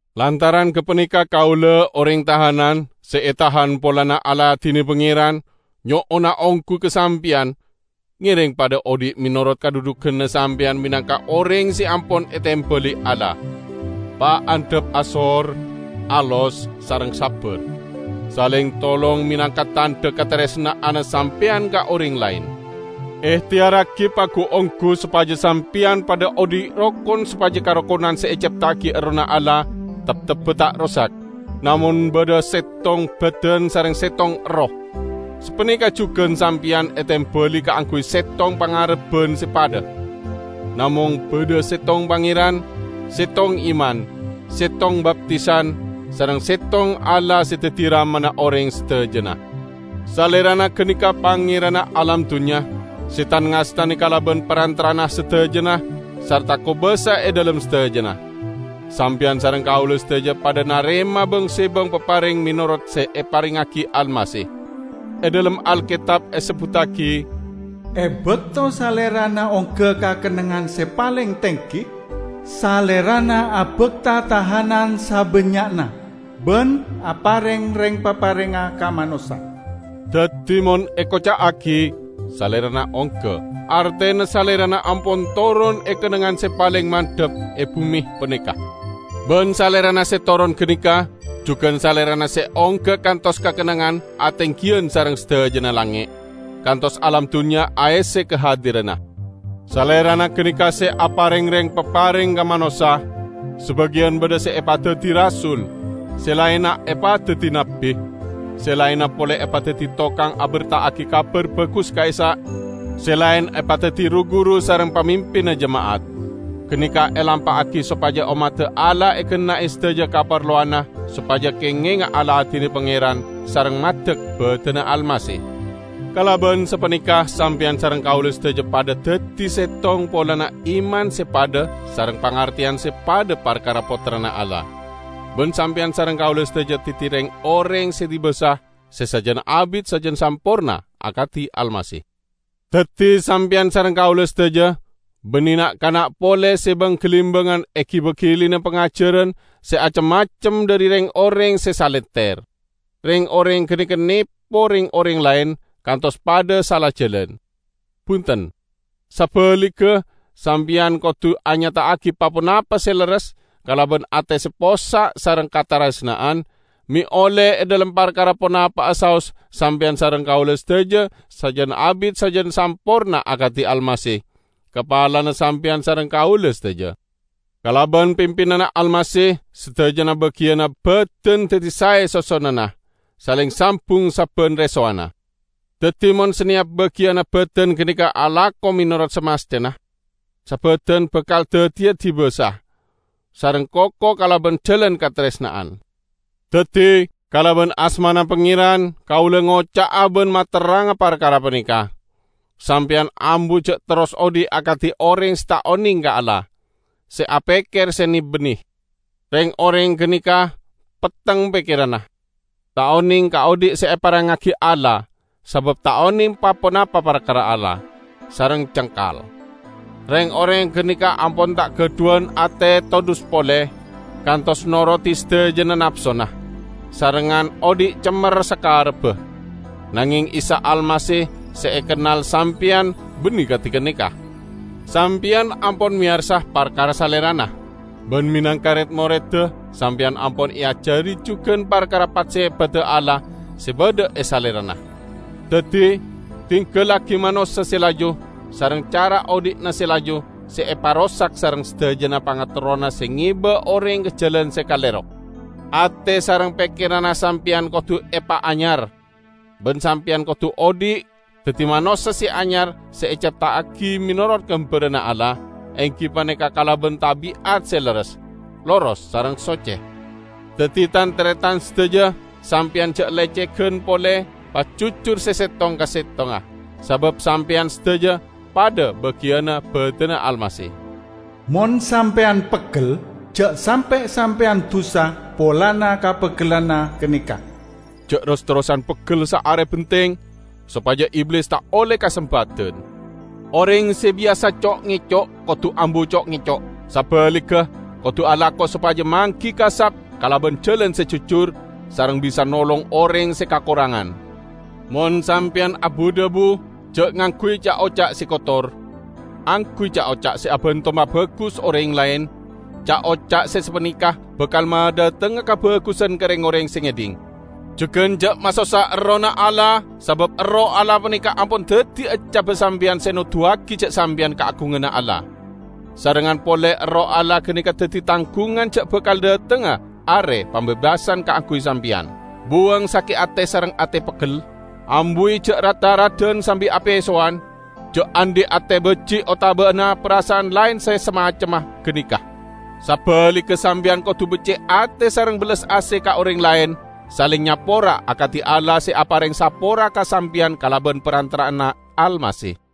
Lantaran gapaneka kaula -- oreng tahanan, se etahan polana aladine Pangeran -- nyo'ona onggu ka sampeyan: ngereng padha odhi' menorot kadhudhuganna sampeyan menangka oreng se ampon etembali Allah. Paandhap asor, alos sareng sabbar. Saleng tolong menangka tandha kataresna'anna sampeyan ka oreng laen. Ehteyarragi pagu-onggu sopaja sampeyan padha odhi' rokon sopaja karokonan se ecepta'agi Errohna Allah teptebba ta' rosak. Namong badha settong badan sareng settong Erroh. Sapaneka jugan sampeyan etembali kaangguy settong pangarebban se padha. Namong badha settong Pangeran, settong iman, settong baptisan, sareng settong Allah se daddi Ramana oreng sadajana. Salerana ganeka Pangeranna alam dunnya, se tan-ngastane kalaban parantara'anna sadajana, sarta kobasa e dhalem sadajana. Sampeyan sareng kaula sadaja padha narema bang-sebang papareng menorot se eparengngagi Almasih. E dhalem Alketab esebbuttagi, "E bakto Salerana ongga ka kennengngan se paleng tenggi, Salerana abakta tahanan sabannya'na, ban apareng reng-paparengnga ka manossa." Daddi, mon ekoca'agi "Salerana ongga" artena Salerana ampon toron e kennengngan se paleng mandhap e bume paneka. Ban Salerana se toron ganeka jugan Salerana se ongga kantos ka kennengngan atenggiyan sareng sadajana langnge', kantos alam dunnya aesse kahadiranna. Salerana ganeka se "apareng reng-papareng ka manossa"; sabagiyan badha se epadaddi rasul, se laenna epadaddi nabbi; se laenna pole epadaddi tokang aberta'agi Kabar Bagus ka'issa', se laen epadaddi ru-guru sareng pamimpinna jema'at. Ganeka elampa'agi sopaja ommadda Allah egenna'e sadaja kaparlowanna sopaja kengenga aladine Pangeran sareng maddek badanna Almasih. Kalaban sapaneka sampeyan sareng kaula sadaja padha daddi settong polana iman se padha sareng pangarteyan se padha parkara Pottrana Allah. Ban sampeyan sareng kaula sadaja daddi reng-oreng se dibasa, se sajan abit sajan samporna akadi Almasih. Daddi sampeyan sareng kaula sadaja banne na'-kana' pole se bang-galimbangan egiba gilina pangajaran se acem-macem dhari reng-oreng se salenter. Reng-oreng ganeka nepo reng-oreng laen kantos padha sala jalan. Bunten! Sabaligga, sampeyan kodu anyata'agi pa-ponapa se lerres kalaban ate se possa' sareng kataresna'an, me' olle e dhalem parkara ponapa'a saos sampeyan sareng kaula sadaja sajan abit sajan samporna akadi Almasih, kapalana sampeyan sareng kaula sadaja. Kalaban pimpinanna Almasih, sadajana bagiyanna badan daddi sae sosonanna, saleng sambung sabban resowanna. Daddi mon saneyap bagiyanna badan ganeka alako menorot samasthena, sabadan bakal daddiya dibasa sareng koko kalaban jalan kataresna'an. Daddi, kalaban asmana Pangeran, kaula ngoca'a ban materranga parkara paneka: sampeyan ambu ja' terros odhi' akadi oreng se ta' oneng ka Allah, se apekker se ne-banne. Reng-oreng ganeka petteng pekkeranna. Ta' oneng ka odhi' se eparengngagi Allah, sabab ta' oneng pa-ponapa parkara Allah, sareng cengkal. Reng-oreng ganeka ampon ta' gadhuwan ate todhus pole, kantos norodi sadajana napsona, sarengngan odhi' cemmer sakarebba. Nangeng Isa Almasih se ekennal sampeyan banne kadi ganeka! Sampeyan ampon meyarsa parkara Salerana; ban menangka red-moredda, sampeyan ampon eajari jugan parkara pat-sepadda Allah se badha e Salerana! Daddi, dinggallagi manossa se laju sareng cara odhi'na se laju se eparosak sareng sadajana pangaterrona se ngeba oreng ka jalan se kalero. Ate sareng pekkeranna sampeyan kodu epaanyar. Ban sampeyan kodu odhi' daddi manossa se anyar se ecepta'agi menorot gambaranna Allah, enggi paneka kalaban tabi'at se lerres, loros sareng socce. Daddi, tan-taretan sadaja, sampeyan ja' lecegan pole; pajujur se settong ka settongnga; sabab sampeyan sadaja padha bagiyanna badanna Almasih. Mon sampeyan peggel, ja' sampe' sampeyan dusa polana kapeggellanna ganeka. Ja' ros-terrosan peggel saare benteng, sopaja Iblis ta' olle kasempadan. Oreng se biyasa co'-ngeco', kodu ambu co'-ngeco'. Sabaligga kodu alako sopaja manggi kasap kalaban jalan se jujur sareng bisa nolong oreng se kakorangan. Mon sampeyan abu-dhabu, ja' ngangguy ca'-oca' se kotor. Angguy ca'-oca' se abanto mabagus oreng laen, ca'-oca' se sapaneka bakal madhatengnga kabagusan ka reng-oreng se ngedhing. Jugan ja' masossa Errohna Allah, sabab Erroh Allah paneka ampon daddi eccabba sampeyan se noduwagi ja' sampeyan kaagunganna Allah; sarengngan pole Erroh Allah ganeka daddi tanggungan ja' bakal dhatengnga Are Pambebasan kaangguy sampeyan. Buwang sake' ate sareng ate peggel. Ambuwi ja' rat-tharadan sambi apesowan, ja' andhi' ate baji' otabana parasa'an laen se samacemma ganeka. Sabaligga, sampeyan kodu becce' ate sareng bellas ase ka oreng laen, saleng nyapora akadi Allah se apareng sapora ka sampeyan kalaban parantara'anna Almasih.